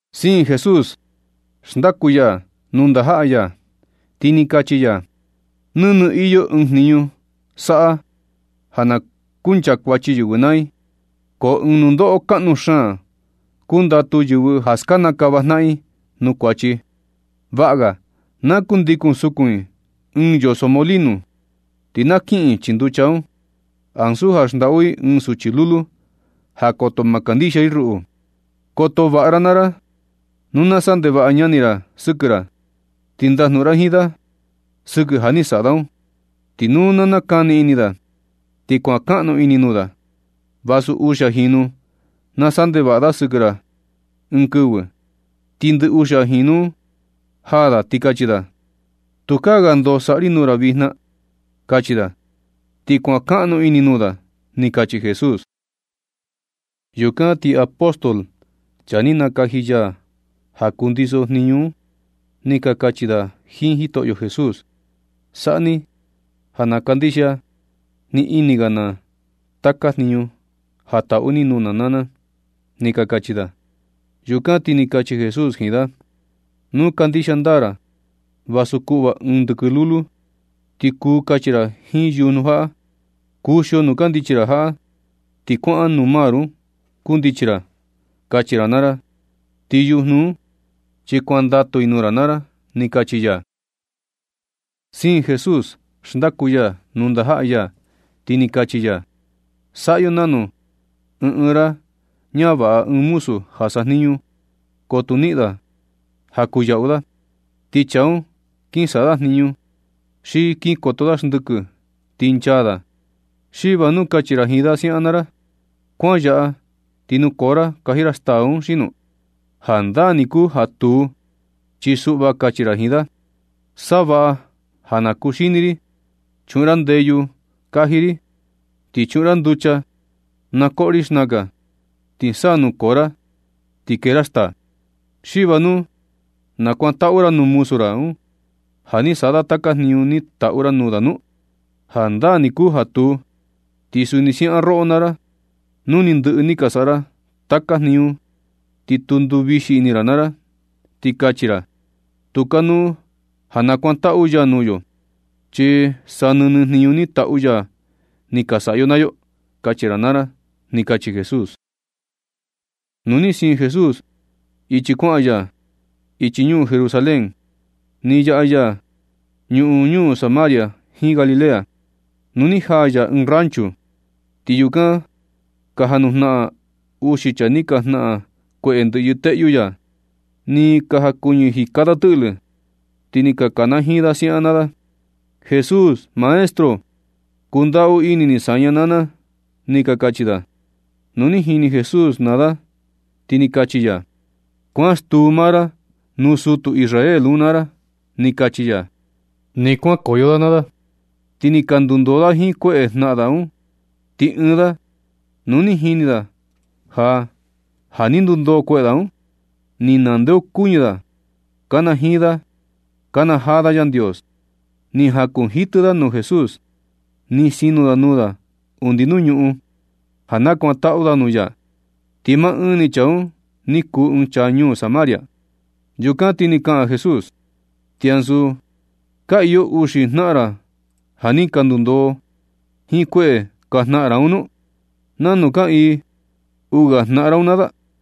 Siin Jesús xndaku ya nuu ndajaꞌa ya, ti ni kachi ya: ―Nɨnɨ iyo ɨɨn jniñu saꞌa ja na kunchakuachi yɨvɨ naa i, ko ɨɨn nundoꞌo kaꞌnu xaan kundatu yɨvɨ ja skanakava jnaꞌan i nuu kuachi. Vaꞌa ga na kundikun sukun i jiin yoso molino, ti na kiꞌin i chii nducha, ansu ja xndaꞌu i ɨɨn suchi lulu ja koto ma kandixia i ruꞌu. Koto vaꞌa ra maa ra. Nu na saꞌa ndevaꞌa ñani ra sɨkɨ ra, ti ndajnuꞌun ra jiin da sɨkɨ ja ni saꞌa da un. Ti nu nakani ini da, ti kuankaꞌnu ini nuu da. Vasu uxia jinu na saꞌa ndevaꞌa da sɨkɨ ra ɨɨn kɨvɨ, ti ndɨ uxia jinu un jaa da ti kachi da: “Tukaa ga ndoo saꞌa ri nuu ra vijna na”, kachi da. Ti kuankaꞌnu ini nuu da ―ni kachi Jesús. Yukan ti apóstol, chaa ni nakaji ya ja kundiso jniñu un, ni ka kachi da jiin Jitoꞌyo Jesús: ―Saꞌa ni ja na kandixia ni ini ga na taka jniñu ja taꞌu ni nuu na ―ni ka kachi da. Yukan ti ni kachi Jesús jiin da: ―Nu kandixia ndaa ra, vasu kuꞌva ɨɨn ndɨkɨn lulu, ti kuu kachi ra jiin yujnu jaꞌa: “Kuxio nuu kandichi ra jaꞌa ti kuaꞌan nuu mar un kundichi ra”, kachi ra naa ra, ti yujnu un chi kuandatu i nuu ra naa ra ―ni kachi ya. Siin Jesús xndaku ya nuu ndajaꞌa ya, ti ni kachi ya: ―Saꞌa yo nanu. Nu ɨɨn ɨɨn ra ñavaꞌa ɨɨn muzu ja sajniñu, ko tu niꞌin da ja kuu yaꞌu da, ti chaa un kin saꞌa da jniñu, xi kin koto da xndɨkɨ ti nchaa da, ¿xi va nu kachi ra jiin da siaꞌan naa ra? “¿Kuan yaꞌa ti nukoo ra kaji ra staa un xino?” Jandaa ni kuu ja tuu, chi suꞌva kachi ra jiin da: “Savaꞌa ja na kuxini ri, chuꞌun ra ndeyu kaji ri, ti chuꞌun ra nducha na koꞌo ri xnakan, ti sa kuu nukoo ra ti kee ra staa.” ¿Xi va nu nakuantaꞌu ra nuu muzu ra un, ja ni saꞌa da taka jniñu ni taꞌu ra nuu da un nu? Jandaa ni kuu ja tuu. Ti suni siaꞌan roꞌo naa ra, nu ni ndɨꞌɨ ni ka saꞌa ra taka jniñu, ti tu nduvixi ini ra naa ra, ti kachi ra: “Tu kanuu ja nakuantaꞌu ya nuu yo, chi sa nɨnɨ jniñu ni taꞌu ya ni ka saꞌa yo naa yo”, kachi ra naa ra ―ni kachi Jesús. Nu ni siin Jesús ichi kuaꞌan ya ichi ñuu Jerusalén, ni yaꞌa ya ñuꞌun ñuu Samaria jiin Galilea. Nu ni jaa ya ɨɨn rancho, ti yukan ka janujnaꞌan uxi chaa ni ka jnaꞌan kueꞌe ndɨꞌyɨ teꞌyu ya. Ni ka jankuñɨ jika da tɨꞌlɨ, ti ni ka kanajiin da siaꞌan naa da: ―¡Jesús! ¡Maestro! Kundaꞌu ini ni saña naa na ―ni ka kachi da. Nu ni jini Jesús da naa da, ti ni kachi ya: ―Kuan stuu maa ra nuu sutu Israel un naa ra ―ni kachi ya. Nɨ kuankoyo da naa da, ti ni ka ndundoo da jiin kueꞌe ka jnaꞌan da un. Ti ɨɨn da, nu ni jini da ja, ja ni ndundoo kueꞌe da un, ni nandeokuñɨ da, kanajiin da nakanajaa da Yandios. Ni jakunjitɨ da nuu Jesús, ni sinu da nuu da undi nuu ñuꞌun ja nakuantaꞌu da nuu ya. Ti maa ɨɨn ni chaa un ni kuu ɨɨn chaa ñuu Samaria. Yukan ti ni kaꞌan Jesús: ―¿Xi ansu ka iyo uxi jnaꞌan ra ja ni ka ndundoo jiin kueꞌe ka jnaꞌan ra un nu? ¿Nanu kaꞌiin uu ga jnaꞌan ra un naa da?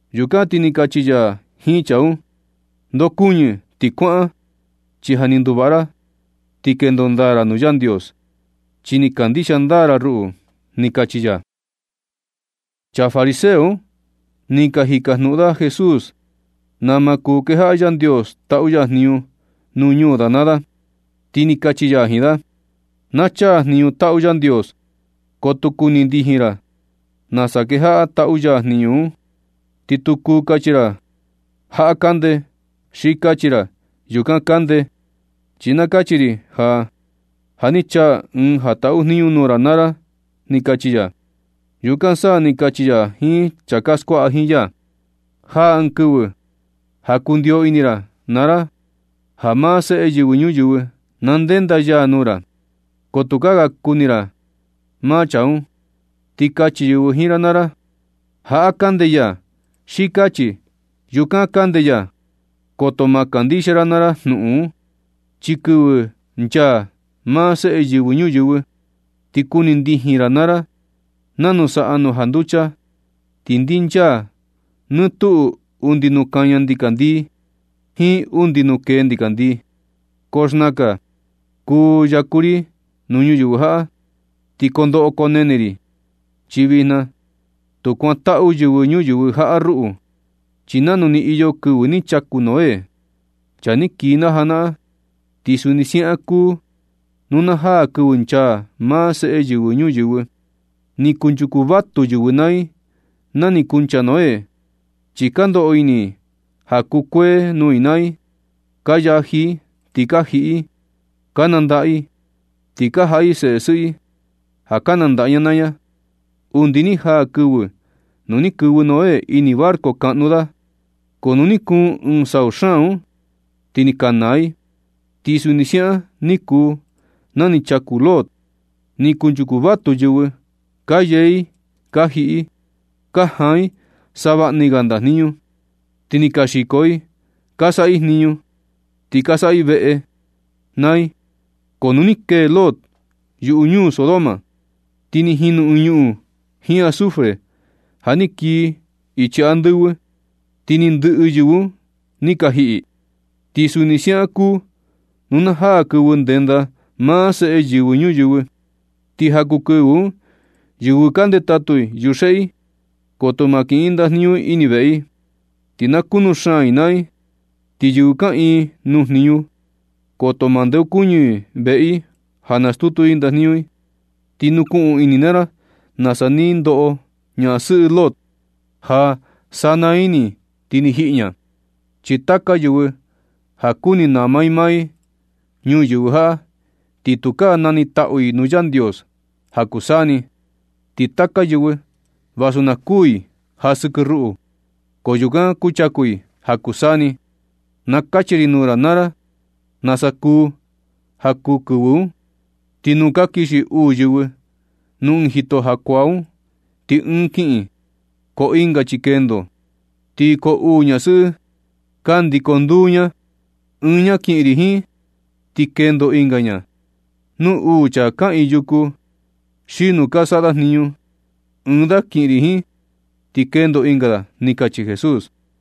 Yukan ti ni kachi ya jiin chaa un: ―Ndokuñɨ ti kuaꞌan, chi ja ni nduvaꞌa ra ti kendo ndaa ra nuu Yandios, chi ni kandixia ndaa ra ruꞌu ―ni kachi ya. Chaa fariseo un ni ka jikajnuꞌun da Jesús nama kuu ja kejaꞌa Yandios taꞌu ya jniñu nuu ñuu da naa da, ti ni kachi ya jiin da: ―Na chaa jniñu taꞌu Yandios, ko tu kuni ndijin ra nasa kejaꞌa ya taꞌu ya jniñu un. Ti tu kuu kachi ra: “Jaꞌa kande”, xi kachi ra: “Yukan kande.” Chi na kachi ri ja, ja ni chaa Ɨɨn ja taꞌu jniñu nuu ra naa ra ―ni kachi ya. Yukan sa ni kachi ya jiin chaa ka skuaꞌa jiin ya: ―Jaa ɨɨn kɨvɨ ja kundiyo ini ra naa ra ja maa Seꞌe Yɨvɨ Ñuyɨvɨ na ndenda ya nuu ra, ko tukaa ga kuni ra maa chaa un. Ti kachi yɨvɨ jiin ra naa ra: “Jaꞌa kande ya”, xi kachi: “Yukan kande ya.” Koto ma kandixia ra naa ra jnuꞌun un. Chi kɨvɨ nchaa maa Seꞌe Yɨvɨ Ñuyɨvɨ, ti kuni ndijin ra naa ra nanu saꞌa nu janducha, ti ndinchaa nɨ tuꞌu undi nuu kaña ndikandii jiin undi nuu kee ndikandii. Ko xnakan kuu yaku ri nuu ñuyɨvɨ jaꞌa, ti kondoꞌo koo nene ri, chi vijna tu kuantaꞌu yɨvɨ ñuyɨvɨ jaꞌa ruꞌu. Chi nanu ni iyo kɨvɨ ni chaku Noé, chaa ni kii na janaꞌan, ti suni siaꞌan kuu nu na jaa kɨvɨ nchaa maa Seꞌe Yɨvɨ Ñuyɨvɨ. Ni kunchuku vatu yɨvɨ naa i nani kuncha Noé, chi ka ndoꞌo ini i ja kukuee nuu i naa i. Ka yaji i, ti ka jiꞌi i, ka nandaꞌa i, ti ka jaꞌa i seꞌe sɨꞌɨ i ka nandaꞌa ña naa ña, undi ni jaa kɨvɨ nu ni kɨvɨ Noé ini barco kaꞌnu da. Ko nu ni kuun ɨɨn sau xaan un, ti ni ka naa i. Ti suni siaꞌan ni kuu na ni chaku Lot. Ni kunchuku vatu yɨvɨ. Ka yee i, ka jiꞌi i, ka jaan i savaꞌni ga ndajniñu, ti ni ka xiko i, ka saꞌa i jniñu, ti ka saꞌa i veꞌe i naa i. Ko nu ni kee Lot yuꞌu ñuu Sodoma, ti ni jinu ñuꞌun jiin azufre ja ni kii ichi andɨvɨ, ti ni ndɨꞌɨ ni yɨvɨ un ni ka jiꞌi. Ti suni siaꞌan kuu nu na jaa kɨvɨ ndenda maa Seꞌe Yɨvɨ Ñuyɨvɨ. Ti ja kuu kɨvɨ un, yɨvɨ ka ndetatu i yuxeꞌe i, koto ma kiꞌin i ɨɨn ndajniñu i ini veꞌe i, ti na kunu xaan i naa i. Ti yɨvɨ kaꞌiin nuu jniñu, koto ma ndeokuñɨ i veꞌe i ja stutu i ni ɨɨn ndajniñu i. Ti nukuꞌun ini naa ra nasa ni ndoꞌo ñasɨꞌɨ Lot ja sa naa ni ti ni jiꞌi ña. Chi taka yɨvɨ ja kuni nama i maa i ñuyɨvɨ jaꞌa, ti tukaa nanitaꞌu i nuu Yandios ja kuu saa ni. Ti taka yɨvɨ vasu na kuu i ja sɨkɨ ruꞌu, ko yukan kuchaku i ja kuu saa ni. Na kachi ri nuu ra naa ra nasa kuu ja kuu kɨvɨ un. Ti nu ka kixi uu yɨvɨ nuu ɨɨn jito jakuaa un, ti ɨɨn ni kiꞌin, ko ɨnga chi kendo. Ti koo uu ñasɨꞌɨ ka ndiko nduu ña; ɨɨn ña kiꞌin ri jiin, ti kendo ɨnga ña. Nu uu chaa kaꞌiin yuku xi nu ka saꞌa da jniñu, ɨɨn da kiꞌin ri jiin, ti kendo ɨnga da ―ni kachi Jesús.